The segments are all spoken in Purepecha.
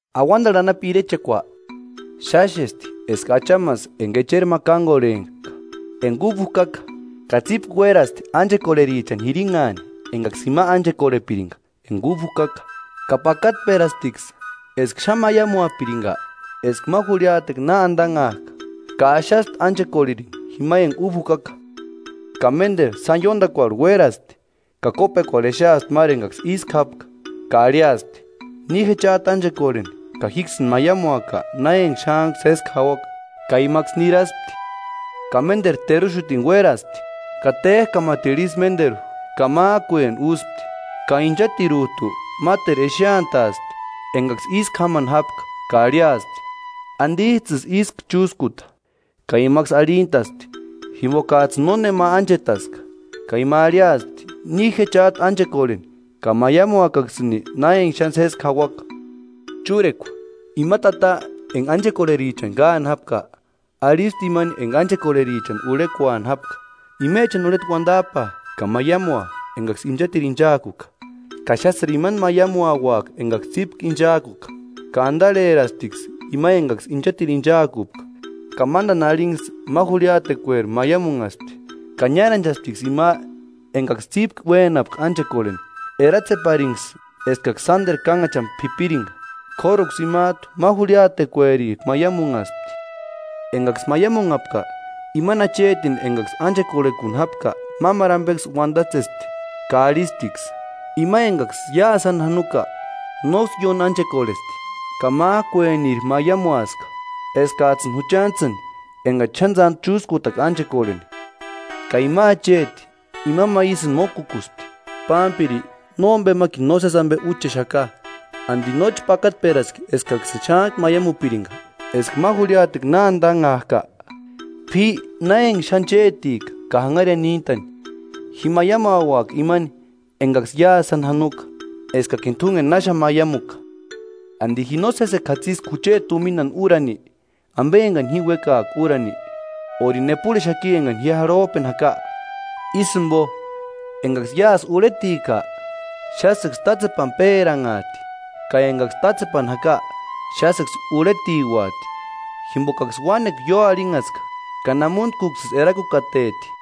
“Auantarhu anapu irechekua, xáxesti eska achamasï enka echerini ma kánkorhek'a enka úba jukaka, ka tsípku uérasti ánchekorherichani jirinhaani enkaksï jima ánchekorhepirinka enka úba jukaka. Ka pakatperasptiksï eska xáni maiamuapirinka eska ma jurhiatekua na antanhak'a, ka axaspti ánchekorheni jima enka úba jukaka. Ka ménteru sáni ióntakuarhu uérasti, ka kópekuarhu exeaspti máru enkaksï ísku jápka, ka arhiaspti: ‘Ni je chát'u ánchekorheni ka jíksïni maiamuaka na enka xántku sésku jauaka.’ Ka imaksï niraspti. Ka ménteru teruxutini uéraspti, ka ték'amatiru isï ménteru, ka mák'ueni úspti. Ka inchatirut'u máteru exeantaaspti enkaksï ísku jámani jápka ka arhiaspti: ‘¿Antits'ïsï ísku chúskuta?’ Ka imaksï arhintaspti: ‘Jimpokats'ïni nónema ánchetaska.’ Ka ima arhiaspti: ‘Ni je chát'u ánchekorheni ka maiamuakaksïni na enka xáni sésku jauaka.’” “Chúrekua, ima tata enka ánchekorherichani káani jápka, arhispti imani enka ánchekorherichani urhekuani jápka: ‘Imechani urheta uantap'aa ka maiamua enkaksï inchatiru inchaakuka, ka xásïri imani maiamuauaka enkaksï tsípku ichaakuka.’ Ka antarherasptiksï ima enkaksï inchatiru ichaakupka ka mántani arhinksï ma jurhiatekueri maiamunhaspti. Ka niáranchasptiksï ima enkaksï tsípku uénapka ánchekorheni, eratseparinksï eskaksï sánteru kánhachani p'ipirinka, k'óruksï imat'u ma jurhiatekuerik'u maiamunhaspti. Enkaksï maiamunhapka, imani achetini enkaksï ánchekorhekuni jápka mámaru ampeksï uantatsespti, ka arhisptiksï: ‘Ima enkaksï iásï sáni janoka nóksï ióni ánchekorhesti, ka mák'ueniri maiamuaska eskats'ïni juchantsïni enkachi xáni tsántu chúskutaka ánchekorheni.’ Ka ima acheti ima ma ísïni mókukuspti: ‘Pámpiri, nómpemakini nósesi ampe úchexaka. ¿Anti nóchi pakatperaspki eskaksïni xántku maiamupirinka eska ma jurhiatekua na antanhak'a? P'i na enka xáni chétika ka janharia níntani. Ji maiamuauaka imani enkaksï iásï sáni janoka eskakini t'únkeni náxani maiamuka. ¿Anti ji no sésekua jatsiski jucheti tuminani úrani, ampe enkani ji uékaaka úrani? ¿Órini epurhexaki enkani ji jarhop'eni jaka?’ Ísï jimpo, enkaksï iásï urhetika, xásïksï tátsepani péranhaati ka enkaksï tátsepani jaka, xásïksï urhetiuati, jimpokaksï uánekua ióarhinhaska ka namuntkuksïsï erakukateti.”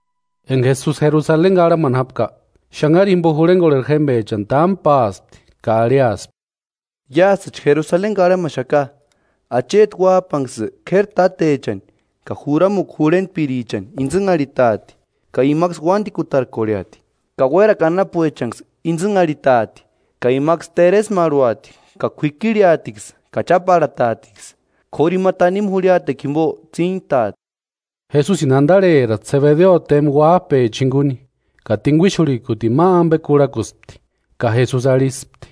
Enka Jesusi Jerusaleni karhamani jápka, xanhari jimpo jurhenkorheri jémpechani támu páaspti ka arhiaspti: “Iásïchi Jerusaleni karhamaxaka, Acheti Uáp'anksï k'éri tátechani ka juramukua jurhentpirichani intsïnharhitaati, ka imaksï uántikutarkorheati, ka uérakua anapuechanksï intsïnharhitaati ka imaksï teresmarhuati ka k'uikirheatiksï ka cháparhataatiksï; k'óru ima tanimu jurhiatekua jimpo tsíntaati.” Jesusini antarheraspti Sebedeo tempa uáp'echa jinkuni, ka t'inkuixurhikutini ma ampe kurhakuspti. Ka Jesusi arhispti: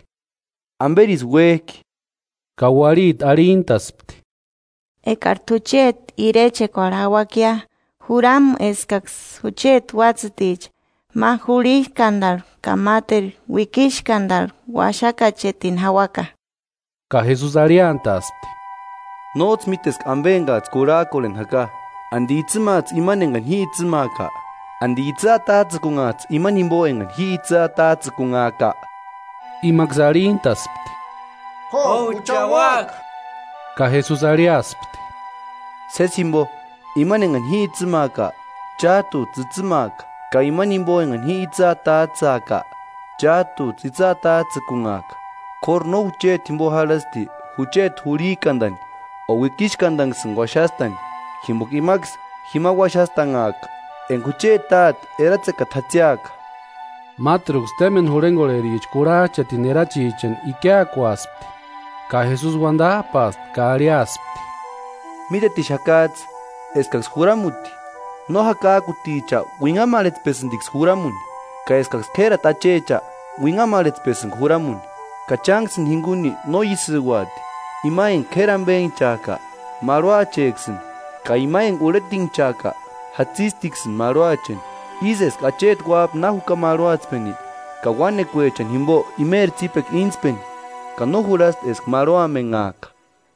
“¿Amperisï uék'i?” Ka uarhiti arhintaspti: “Ekari t'u chéti irechekuarhu jauakia, juramu eskaksïni jucheti uátsïticha, ma jurhik'antani ka máteru uikixkantani uaxakachetini jauaka.” Ka Jesusi arhiantaaspti: “Nóts'ï míteska ampe enkats'ï kurhak'orheni jaka. ¿Anti itsïmats'ï imani enkani ji itsïmaaka? ¿Anti itsï atats'ïkunhats'ï imani jimpo enkani ji itsï atats'ïkunhaaka?” Imaksï arhintaspti: “Jo, jucha úaka.” Ka Jesusi arhiaspti: “Sési jimpo imani enkani ji itsïmaaka, chát'uts'ï itsïmaaka, ka imani jimpo enkani ji itsï atats'ïaka, chát'uts'ï itsï atats'ïkunhaaka, k'óru no jucheti jimpo jarhasti jucheti jurhik'antani o uikixkantanksïni uaxastani, jimpoka imaksï jima uaxastanhaaka enka jucheti Táte eratsekata jatsiaka.” Máteruksï témpeni jurhenkorhericha kurhach'aatini erachichanksï ikiakuaspti. Ka Jesusi uantap'aaspti ka arhiaaspti: “Mítetixakats'ï eskaksï juramuti no jakak'uticha uinhamarhetspesïnka juramuni, ka eskaksï k'érati achecha úinhamarhetspesïnka juramuni. Ka chánksïni jinkuni no ísïuati, ima enka k'éri ampenhchak'a, marhuacheksïni, ka ima enka urhetinhchak'a, jatsistiksïni marhuacheni; ísï eska Acheti Uáp'a na juka marhuatspeni, ka uánekuechani jimpo imeri tsípekua íntspeni ka no jurhasti eska marhuamenhaaka.”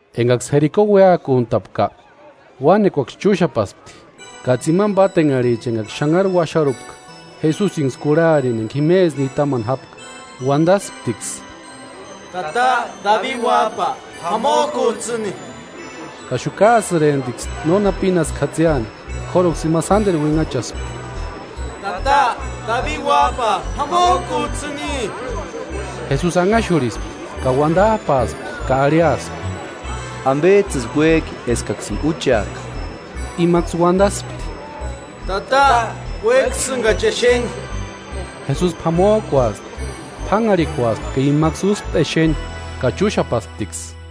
Enkaksï Jeriko uéakuntapka, uánekuaksï chúxapaxapti. Ka tsimani pátenharhichaksï enkaksï xanharu uaxarupka, Jesusinksï kurharini enka jimesï nitamani jápka uantasptiksï: “¡Tata, Dabi Uáp'a, p'amok'uts'ïni!” Ka xukaasïremptiksï nónaksï pínasku jatsiani, k'óruksï ima sánteru uinhachaspti: “¡Tata, Dabi Uáp'a p'amok'uts'ïni!” Jesusi anhaxurhispti ka uantap'aaspti ka arhiaspti: “¿Ampets'ïsï uék'i eskaksïni úcheaka?” Imaksï uantaspti: “Tata, uékasïnkachi exeni.” Jesusi p'amok'uaspti, p'ánharhikuaspti ka imaksï úspti exeni ka chúxapasptiksï.